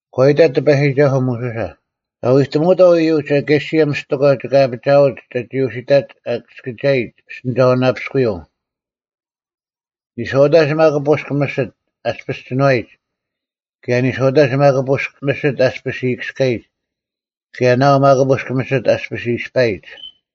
ᒂ ᐃᑕᑦ ᑎᐸᔨᒋᒐᓱᐤ ᒧᓱᓴ, “ᒐ ᐎᑎᒧᐅᑥᐤ ᐃᔪᒡ ᐊᑲᓯᔭ ᒥᔅᑎᒂ ᒋᑭ ᐊᐱᒋᐊᒡ ᒐᒋ ᐅᓯᑕᒡ ᐊᑭᔅᑭᒐᔨᒡ ᐱᔅᑎᓂᒐᐅᓇᐱᔅᑯᔪᐤ᙮ ᓂᔄᐅᑕᒡ ᒪᒃ ᐳᔅᒄ ᒥᓯᑦ ᐊᔅᐱᔅ ᒋᓏᔨᒡ ᑭᔭ ᓂᔄᐅᑕᒡ ᒪᒃ ᐳᔅᒄ ᒥᓯᑦ ᐊᔅᐱᔅ ᐃᔨᑭᔅᑲᔨᒡ ᑭᔭ ᓇᐤ ᒪᒃ ᐳᔅᒄ ᒥᓯᑦ ᐊᔅᐱᔅ ᐃᔅᐸᔨᒡ᙮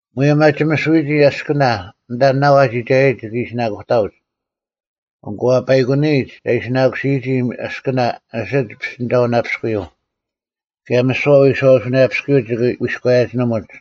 ᒧᔭᒻ ᐊ ᒋᒥᓱᔨᒋ ᐊᔅᑭᓇ ᐊᓐᑕ ᓇᐤ ᐊ ᒋᒐᔭᒡ ᒋᑭ ᐃᓯᓇᑯᑕᐅᒡ᙮ ᐊᑯ ᐊ ᐸᐃᑯᓂᔨᒡ ᒐ ᐃᓯᓇᑯᓯᔨᒋ ᐊᔅᑭᓇ ᐊᓯᒡ ᐱᔅᑎᓂᒐᐅᓇᐱᔅᑯᔪᐤ᙮ ᑭᔭ ᒥᓯᐛ ᐎᔄᐛᐱᔅᑯᔪᐤ ᒋᑭ ᐎᔎᔭᒋᓂᒧᒡ᙮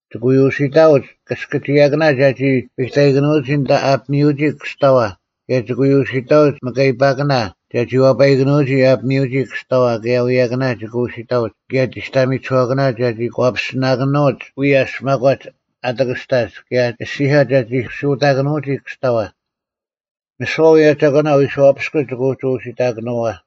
ᒋᑭ ᐎ ᐅᓯᑕᐅᒡ ᑭᔅᑭᒋᔭᑭᓇ ᒐᒋ ᐱᑕᐃᑭᓄᔨᒋ ᐊᓐᑕ ᐊ ᐱᒥᐅᒋ ᑭᔅᑕᐛ, ᑭᔭ ᒋᑭ ᐎ ᐅᓯᑕᐅᒡ ᒥᑲᐃᐸᑭᓇ ᒐᒋ ᐛᐸᔨᑭᓄᐅᒋ ᐊ ᐱᒥᐅᒋ ᑭᔅᑕᐛ, ᑭᔭ ᐎᔭᑭᓇ ᒋᑭ ᐅᓯᑕᐅᒡ ᑭᔭ ᒋᔅᑕᒥᒋᓱᐛᑭᓇ ᒐᒋ ᒂᐱᔅᒋᓇᑭᓄᐅᒡ ᐎᔭᔅ ᒪᒂᒡ ᐊ ᑎᑭᔅᑕᒡ ᑭᔭ ᐊᔅᒋᒂ ᒐᒋ ᓱᑕᑭᓄᐅᒋ ᑭᔅᑕᐛ᙮ ᒥᓯᐛ ᐅᔭ ᒐᒂᓇ ᐎᔄᐛᐱᔅᑯᒡ ᒋᑭ ᐎ ᐅᒋ ᐅᓯᑕᑭᓄᐅᐛ᙮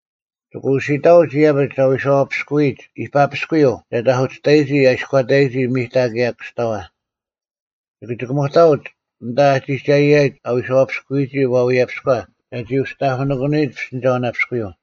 ᒋᑭ ᐅᓯᑕᐅᒡ ᐃᔭᐱᒡ ᐊ ᐎᔄᐛᐱᔅᑯᔨᒡ ᐃᐸᐱᔅᑯᔪᐤ ᒐ ᑕᐧᑯᓯᔅᑕᑭᓄᔨᒋ ᐊ ᐃᔎᑕᒋ ᒥᑕ ᑭᔭ ᑭᔅᑕᐛ᙮ ᒋᑭ ᒋᑭᒧᑕᐅᒡ ᐊᓐᑕ ᐊᒋᒐᔨᒡ ᐊ ᐎᔄᐛᐱᔅᑯᔨᒋ ᐛᐎᔭᐱᔎ ᒐᒋ ᐅᒋ ᑕᐧᑯᓂᑭᓄᔨᒡ ᐱᔅᑎᓂᒐᐅᓇᐱᔅᑯᔪᐤ᙮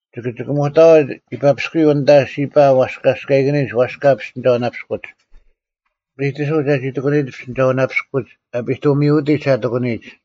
ᒋᑭ ᒋᑭᒧᑕᐅᒡ ᐃᐸᐱᔅᑯᔪᐤ ᐊᓐᑕ ᓯᐸ ᐛᔅᑲᔅᑲᐃᑭᓂᒡ ᐛᔅᑲ ᐱᔅᑎᓂᒐᐅᓇᐱᔅᑯᒡ, ᐱᑎᓱᐤ ᒐᒋ ᑎᑭᑯᓂᔨᒡ ᐱᔅᑎᓂᒐᐅᓇᐱᔅᑯᒡ ᐊᐱᑐᒥᐅᑎᒡ ᒐ ᑎᑯᓂᔨᒡ᙮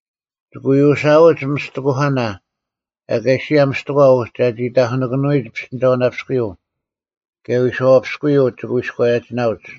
ᒋᑭ ᐎ ᐅᓯᐊᐅᒡ ᒥᔅᑎᑯᐧᑲᓇ ᐊᑲᓯᔭ ᒥᔅᑎᒂ ᐅᒡ ᒐ ᐅᒋ ᑕᐧᑯᓇᑭᓄᔨᒡ ᐱᔅᑎᓂᒐᐅᓇᐱᔅᑯᔪᐤ ᑭᔭ ᐎᔄᐛᐱᔅᑯᔪᐤ ᒋᑭ ᐎᔎᔭᒋᓇᐅᒡ᙮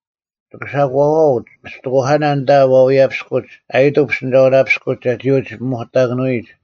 ᒋᑭ ᓴᒂᐅᒡ ᒥᔅᑎᑯᐧᑲᓇ ᐊᓐᑕ ᐛᐎᔭᐱᔅᑯᒡ ᐊᔨᑐᐤ ᐱᔅᑎᓂᒐᐅᓇᐱᔅᑯᒡ ᒐᒋ ᐅᒋ ᐸᒧᑕᑭᓄᔨᒡ᙮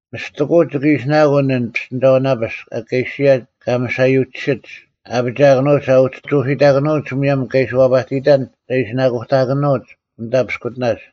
ᒥᔅᑎᑯᐅᑦ ᒋᑭ ᐃᓯᓇᑯᓐ ᐊᓐ ᐱᔅᑎᓂᒐᐅᓇᐱᔅᒄ ᐊᑲᐃᓯᔭ ᑲᒥᓴᔪᒋᓯᒡ ᐊ ᐊᐱᒋᐊᑭᓄᐅᒡ ᐊ ᐅᒋ ᐅᓯᑕᑭᓄᐅᒡ ᒧᔭᒻ ᑲ ᐃᓯ ᐛᐸᑎᔨᑕᓐ ᒐ ᐃᓯᓇᑯᑕᑭᓄᐅᒡ ᐅᑕ ᐱᔅᑯᑎᓇᒡ᙮”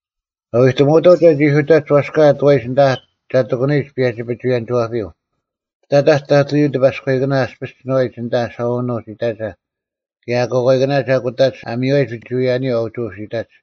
“ᒐ ᐎᑎᒧᐅᑥᐤ ᒐᒋ ᐅᓯᑕᒡ ᐛᔅᑲ ᐊᑐᐛᔨᒡ ᐊᓐᑕ ᒐ ᑎᑯᓂᔨᒡ ᐸᔭᒋ-ᐱᒍᐎᔭᓂᒋᐛᐱᔪᐤ᙮ ᐱᑕᑕᒡ ᑕᑐᔪᐤ ᑎᐸᔎᐃᑭᓇ ᐊᔅᐱᔅ ᒋᓏᔨᒡ ᐊᓐᑕ ᓴᐅᓄᒡ ᐃᑕᒐ ᑭᔭ ᐊᑯᐛᑲᐃᑭᓇ ᒐ ᑯᑕᒡ ᐊ ᒥᔽᔨᒡ ᐱᒍᐎᔭᓂᔪᐤ ᐊ ᐅᒋ ᐅᓯᑕᒡ᙮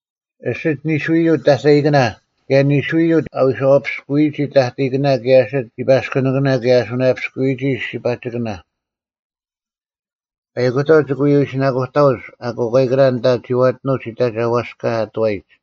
ᐊᓯᒡ ᓂᓱᔪᐤ ᑕᑕᐃᑭᓇ ᑭᔭ ᓂᓱᔪᐤ ᐊ ᐎᔄᐛᐱᔅᑯᔨᒋ ᑕᑕᐃᑭᓇ ᑭᔭ ᐊᓯᒡ ᓯᐸᔅᑯᓂᑭᓇ ᑭᔭ ᐊ ᓱᓇᔭᐱᔅᑯᔨᒋ ᓯᒋᐸᒋᑭᓇ᙮ ᐸᐃᑯᑕᐤ ᒋᑭ ᐎ ᐃᓯᓇᑯᑕᐅᒡ ᐊᑯᐛᑲᐃᑭᓇ ᐊᓐᑕ ᒋᐛᑎᓄᒡ ᐃᑕᒐ ᐛᔅᑲ ᐊᑐᐛᔨᒡ᙮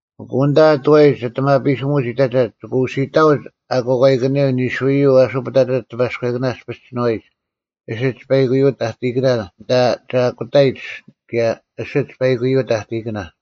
ᐊᑯ ᐊᓐᑕ ᐊᑐᐛᒡ ᐊᑎᒪᐱᓯᒧᑕᒡ ᐃᑕᒐ ᒋᑭ ᐅᓯᑕᐅᒡ ᐊᑯᐛᑲᐃᑭᓂᔪᐤ ᓂᓱᔪᐤ ᐊᓱ ᐸᑕᑕᒡ ᑎᐸᔎᐃᑭᓇ ᐊᔅᐱᔅ ᒋᓏᔨᒡ ᐊᓯᒡ ᐸᐃᑯᔪᐤ ᑕᑕᐃᑭᓇ ᐊᓐᑕ ᒐ ᐊᑯᑕᔨᒡ ᑭᔭ ᐊᓯᒡ ᐸᐃᑯᔪᐤ ᑕᑕᐃᑭᓇ᙮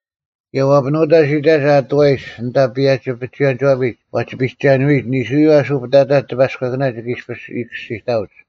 ᑭᔭ ᐛᐱᓄᑕᒡ ᐃᑕᒐ ᐊᑐᐛᔨᒡ ᐊᓐᑕ ᐸᔭᒋ-ᐱᒍᐎᔭᓂᒋᐛᐱᒡ ᐛᒋᐱᔨᒐᓄᔨᒡ ᓂᓱᔪᐤ ᐊᓱ ᐸᑕᑕᒡ ᑎᐸᔎᐃᑭᓇ ᒋᑭ ᐊᔅᐱᔅ ᐃᔨᑭᔅᒋᑕᐅᒡ᙮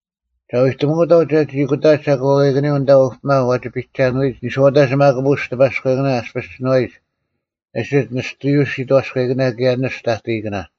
ᒐ ᐎᑎᒧᐅᑥᐤ ᒐᒋ ᐊᑯᑕᒡ ᐊᑯᐛᑲᐃᑭᓂᔪᐤ ᐊᓐᑕ ᐅᐱᒪ ᐛᒋ ᐱᒐᓄᐎᔨᒡ ᓂᔄᐅᑕᒡ ᒪᒃ ᐳᔅᒄ ᑎᐸᔎᐃᑭᓇ ᐊᔅᐱᔅ ᒋᓏᔨᒡ ᐊᓯᒡ ᓂᔅᑐ ᓯᑥᔎᐃᑭᓇ ᑭᔭ ᓂᔅᑐ ᑕᑕᐃᑭᓇ᙮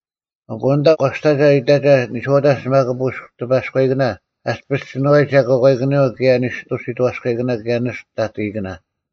ᐊᑯ ᐊᓐᑕ ᒂᔅᑕᒐ ᐃᑕᒐ ᓂᔄᐅᑕᒡ ᒪᒃ ᐳᔅᒄ ᑎᐸᔎᐃᑭᓇ ᐊᔅᐱᔅ ᒋᓏᔨᒡ ᐊᑯᐛᑲᐃᑭᓂᔪᐤ ᑭᔭ ᓂᔅᑐ ᓯᑥᔎᐃᑭᓇ ᑭᔭ ᓂᔅᑐ ᑕᑕᐃᑭᓇ᙮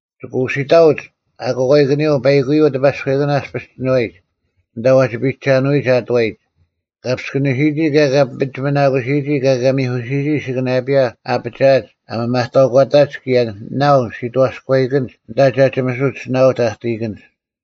ᒋᑭ ᐅᓯᑕᐅᒡ ᐊᑯᐛᑲᐃᑭᓂᔪᐤ ᐸᐃᑯᔪᐤ ᑎᐸᔎᐃᑭᓇ ᐊᔅᐱᔅ ᒋᓏᔨᒡ ᐊᓐᑕ ᐛᒋ ᐱᒐᓄᔨᒡ ᐊᑐᐛᔨᒡ, ᑲ ᐱᔅᑭᓂᓯᔨᒋ ᑭᔭ ᑲ ᐱᒋᒥᓇᑯᓯᔨᒋ ᑭᔭ ᑲ ᒥᐧᑯᓯᔨᒋ ᐊᓯᑭᓇᔭᐱᔭ ᐊ ᐊᐱᒋᐊᒡ ᐊ ᒥᒪᑕᐅᒂᑕᒡ ᑭᔭ ᓇᐤ ᓯᑥᔎᐃᑭᓐᒡ ᐊᓐᑕ ᒐ ᒋᒥᓱᒡ ᓇᐤ ᑕᑕᐃᑭᓐᒡ᙮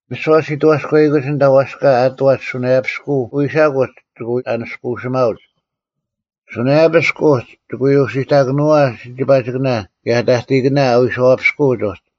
ᒥᓯᐛ ᓯᑥᔎᐃᑭᓐᒡ ᐊᓐᑕ ᐛᔅᑲ ᐊᑐᐛᒡ ᓱᓇᔭᐱᔅᑯᐤ ᐃᓴᑯᒡ ᒋᑭ ᐎ ᐊᓂᔅᑯᓯᒪᐅᒡ᙮ ᓱᓇᔭᐱᔅᒄ ᐅᒡ ᒋᑭ ᐎ ᐅᓯᑕᑭᓄᐅᐛ ᓯᒋᐸᒋᑭᓇ ᑭᔭ ᑕᑕᐃᑭᓇ ᐎᔄᐛᐱᔅᑯᒡ ᐅᒡ᙮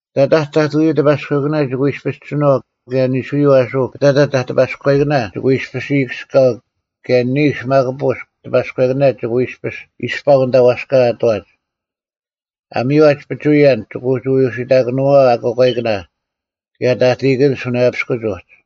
ᐱᑕᑕᒡ ᑕᑐᔪᐤ ᑎᐸᔎᐃᑭᓇ ᒋᑭ ᐎ ᐃᔅᐱᔅ ᒋᓏᐤ ᑭᔭ ᓂᓱᔪᐤ ᐊᓱ ᐱᑕᑕᒡ ᑎᐸᔎᐃᑭᓇ ᒋᑭ ᐎ ᐃᔅᐱᔅ ᐃᔨᑭᔅᑲᐤ ᑭᔭ ᓂᓱ ᒪᒃ ᐳᔅᒄ ᑎᐸᔎᐃᑭᓇ ᒋᑭ ᐎ ᐃᔅᐱᔅ ᐃᔅᐸᐤ ᐊᓐᑕ ᐛᔅᑲ ᐊᑐᐛᒡ᙮ ᐊ ᒥᔽᒡ ᐱᒍᐎᔭᓐ ᒋᑭ ᐎ ᐅᒋ ᐅᓯᑕᑭᓄᐅᐛ ᐊᑯᐛᑲᐃᑭᓇ ᑭᔭ ᑕᑕᐃᑭᓐᒡ ᓱᓇᔭᐱᔅᑯᒡ ᐅᒡ᙮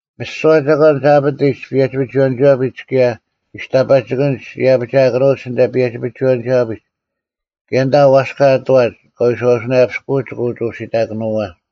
ᒥᓯᐛ ᒐᒂᓐ ᒐ ᐊᐱᑎᒡ ᐸᔭᒋ-ᐱᒍᐎᔭᓂᒋᐛᐱᒡ ᑭᔭ ᒋᔅᑕᐸᒋᑭᓐᒡ ᐃᔭᐱᒋᐊᑭᓄᐅᒡ ᐊᓐᑕ ᐸᔭᒋ-ᐱᒍᐎᔭᓂᒋᐛᐱᒡ ᑭᔭ ᐊᓐᑕ ᐛᔅᑲ ᐊᑐᐛᒡ ᑲ ᐎᔄᐛᐱᔅᑯᐅᒡ ᒋᑭ ᐅᒋ ᐅᓯᑕᑭᓄᐅᐛ᙮”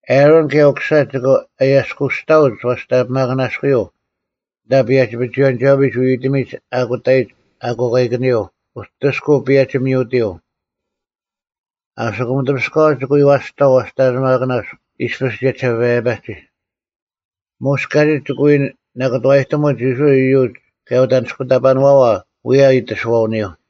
ᐊᕋᓐ ᑭᔭ ᐅᑯᓴ ᒋᑭ ᐊᔭᔅᑯᔅᑕᐅᒡ ᐛᔅᑕᓂᐱᒪᑭᓇᔅᑯᔪᐤ ᐊᓐᑕ ᐸᔭᒋ-ᐱᒍᐎᔭᓂᒋᐛᐱᒡ ᐎᐎᑎᒥᒡ ᐊᑯᑕᔨᒡ ᐊᑯᐛᑲᐃᑭᓂᔪᐤ ᐅᑎᔅᑯᐤ ᐸᔭᒋ-ᒥᐅᑎᔪᐤ᙮ ᐊᓯᑯᒻ ᑕᐱᔅᑲᐛ ᒋᑭ ᐎ ᐛᔅᑕᐤ ᐛᔅᑕᓂᐱᒪᑭᓇᔅᒄ ᐃᔅᐱᔅ ᒋᔭᒋᓴᐸᔭᒋ᙮ ᒧᔅ ᑲᒋᒡ ᒋᑭ ᐎ ᓇᑭᑐᐛᔨᑎᒧᒡ ᐃᔅᕋᐃᓪ ᐃᔪᒡ ᑭᔭ ᐅᑦ ᐊᓂᔅᑯᑕᐸᓄᐛᐛ ᐅᔭ ᐃᑎᓱᐛᐅᓂᔪᐤ᙮”